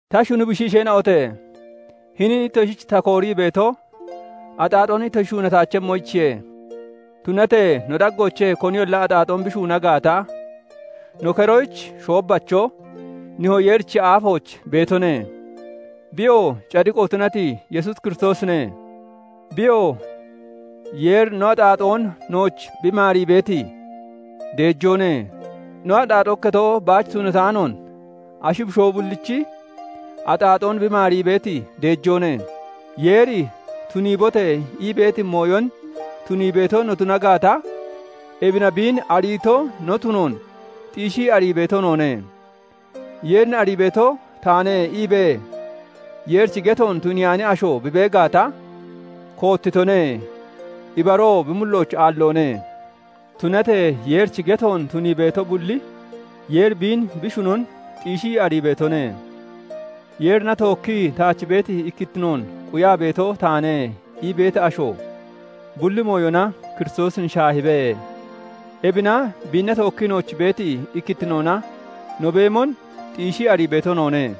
Ta shuni bushiisheena'ote! Hinin ittoshich ta koorii beeto, axaaxoon ittoshi shuunataachemmoyichiye; tunatee no daggoochee koniyolla axaaxoon bi shuuna gaata, no keroyich shoobbacho Nihoo Yeerichi aafooch beetone; biyoo cadiqo tunati Yesuus Kiristoosine. Biyoo Yeeri no axaaxoon nooch bi maarii beeti deejoone; no axaaxoo ikketon baach tunataanoon ashi bushoo bullichi axaaxoon bi maarii beeti deejoone. Yeeri "Tuniibote!" ii beeti mooyon tunii beeto no tuna gaata, ebina biin ariito no tunoon xiishii arii beeto noone. "Yeerin arii beeto taane" iibee Yeerichi getoon tuniyaani asho bi bee gaata, koottitone; ibaroo bi mullooch aalloone. Tunatee Yeerichi getoon tunii beeto bulli, Yeeri biin bi shunon xiishii arii beetone. "Yeerina tookkii taach beeti ikkittinoon quyaa beeto taane" ii beeti asho, bulli mooyona Kiristoosin shaahibe. Ebina biinna tookkii nooch beeti ikkittinoona no beemon xiishii arii beeto noone.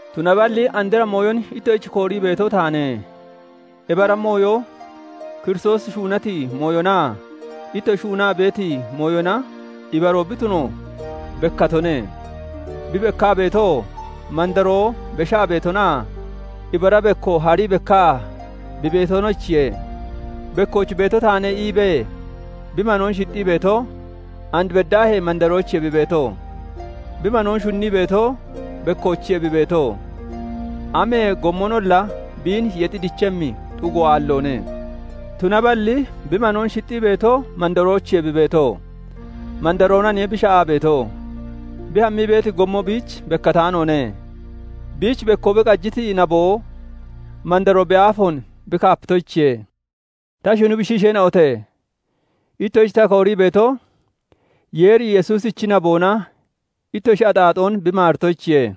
Tunaballi andra mooyon ittoshich koorii beeto taane; ebi ara mooyo Kiristoosi shuunati mooyonaa ittoshi shuunaa beeti mooyona ibaroo bi tuno bekkatone. Bi bekkaa beetoo, mandaroo beshaa beetonaa ibara bekko harii bekkaa bi beetonoyichiye. "Bekkooch beeto taane" iibee bi manoon shixxii beeto, and beddaahee mandaroochiye bi beeto. Bi manoon shunnii beeto bekkoochiye bi beeto; amee gommonolla biin yexi dichemmi xugo aalloone. Tunaballi bi manoon shixxii beeto mandaroochiye bi beeto; mandaroonaniye bi sha'aa beeto. Bi hammii beeti gommo biich bekkataanoone. Biich bekko bi qajiti naboo, mandaroo bi aafoon bi kaapitoyichiye. Ta shuni bushiisheena'ote! Ittoshich ta koorii beeto, Yeeri Yesuusichi naboona ittoshi axaaxoon bi maaritoyichiye.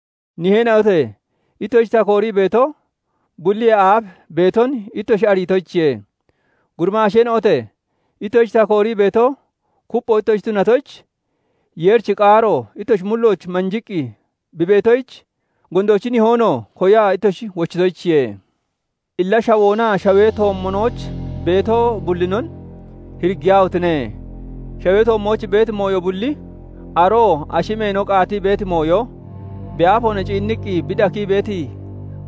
Niheena'ote! Ittoshich ta koorii beeto, bulliyee aaf beeton ittoshi ariitoyichiye. Gurimaasheena'ote! Ittoshich ta koorii beeto, kuppho ittoshi tunatoyich, Yeerichi qaaroo ittoshi mullooch manjiqqi bi beetoyich, gondoochi nihoonoo koyaa ittoshi wochitoyichiye. Illa shawoonaa shawee toommonooch beeto bullinon hiriggiyaahotine! Shawee toommooch beeti mooyo bulli, aroo ashi meeno qaatii beeti mooyo, bi aafoona ciinniqqi bi dakii beeti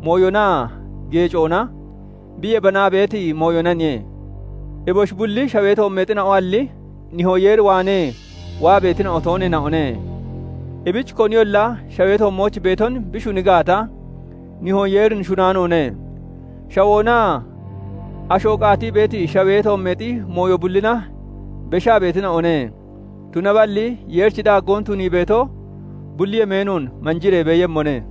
mooyonaa geecoona bi yebanaa beeti mooyonaniye; eboshi bulli shawee toommeexina'oalli Nihoo Yeer waanee waa beetina'o tooneena'one. Ebich koniyolla shawee toommooch beeton bi shuni gaata, Nihoo Yeerin shunaanoone. Shawoonaa asho qaatii beeti shawee toommeexi mooyo bullina beshaa beetina'one; tunaballi Yeerichi daaggoon tunii beeto, bulli yemeenoon manjiree beeyemmone.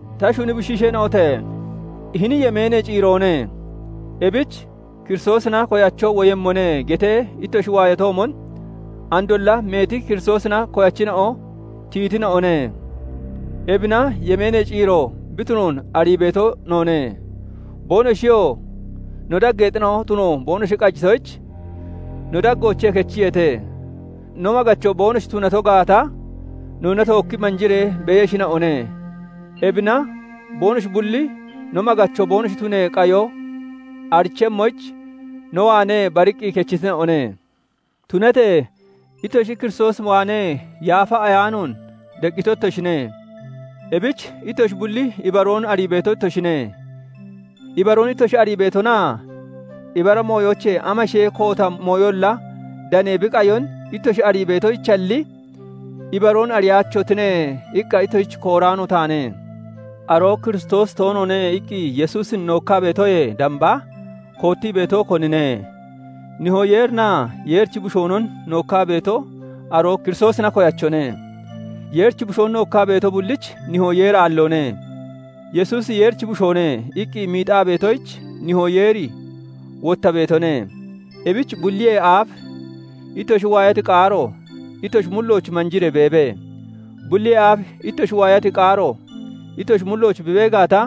Ta shuni bushiisheena'ote! Hini yemeenee ciiroone; ebich "Kiristoosina koyacho woyemmone" getee ittoshi waayatoomon, andolla meeti Kiristoosina koyachina'o tiyitina'one. Ebina yemeenee ciiro bi tunoon arii beeto noone. Boonoshiyoo no daggeexina'o tuno boonoshi qajitoyich, no daggoochee kechiyeete. no maggacho boonoshi tunato gaata, noonna tookki manjiree beeyeshina'one. Ebina boonoshi bulli no maggacho boonoshi tunee qayo arichemmoyich, no waanee bariqqi kechitina'one. Tunatee ittoshi Kiristoos waanee Yaafa Ayaanoon deqqito ittoshine; ebich ittoshi bulli ibaroon arii beeto ittoshine. Ibaroon ittoshi arii beetonaa ibara mooyoochee amashee koota mooyolla danee bi qayon ittoshi arii beetonoyichalli, "Ibaroon ariyaachotine" iqqa ittoshich kooraano taane. "Aroo Kiristoosi toonoone" iqqi Yesuusin nookkaa beetoyee damba koottii beeto, konine? Nihoo Yeerinaa Yeerichi Bushoonon nookkaa beeto aroo Kiristoosina koyachone. Yeerichi Bushoon nookkaa beeto bullich Nihoo Yeeri aalloone; "Yesuusi Yeerichi Bushoone" iqqi miixaa beetoyich Nihoo Yeeri wotta beetone. Ebich bulliyee aaf ittoshi waayati qaaro ittoshi mullooch manjiree beebe. Bulliyee aaf ittoshi waayati qaaro ittoshi mullooch bi bee gaata,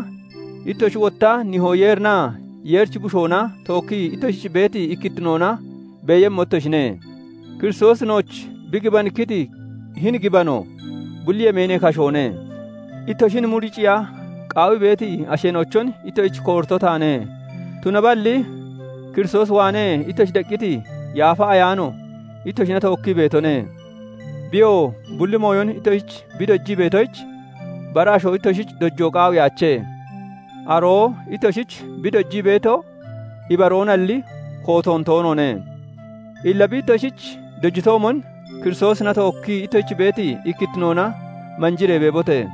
ittoshi wotta Nihoo Yeerinaa Yeerichi Bushoona tookkii ittoshich beeti ikkittinoona beeyemmo ittoshine. Kiristoosi nooch bi gibanikkiti hini gibano, bulli yemeenee kashoone. Ittoshin muricciya qaawii beeti asheena'ochon ittoshich koorito taane. Tunaballi Kiristoos waanee ittoshi deqqiti Yaafa Ayaano ittoshina tookkii beetone. Biyoo bulli mooyon ittoshich bi dojii beetoyich, bara asho ittoshich dojoo qaawiyaache. Aroo ittoshich bi dojii beeto ibaroonalli kootoon toonoone. Illa bi ittoshich dojitoomon Kiristoosina tookkii ittoshich beeti ikkittinoona manjiree beebote!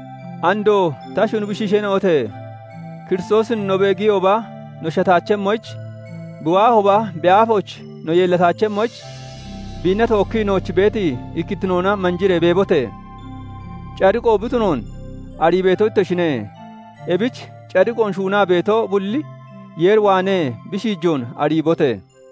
Andoo ta shuni bushiisheena'ote! Kiristoosin no beegiyooba no shataachemmoyich, bi waahooba bi aafooch no yeellataachemmoyich, biinna tookkii ittoshich beeti ikkittinoona manjiree beebote! Cadiqo bi tunoon arii beeto ittoshine; ebich cadiqoon shuunaa beeto bulli Yeer waanee bi shiijoon ariibote!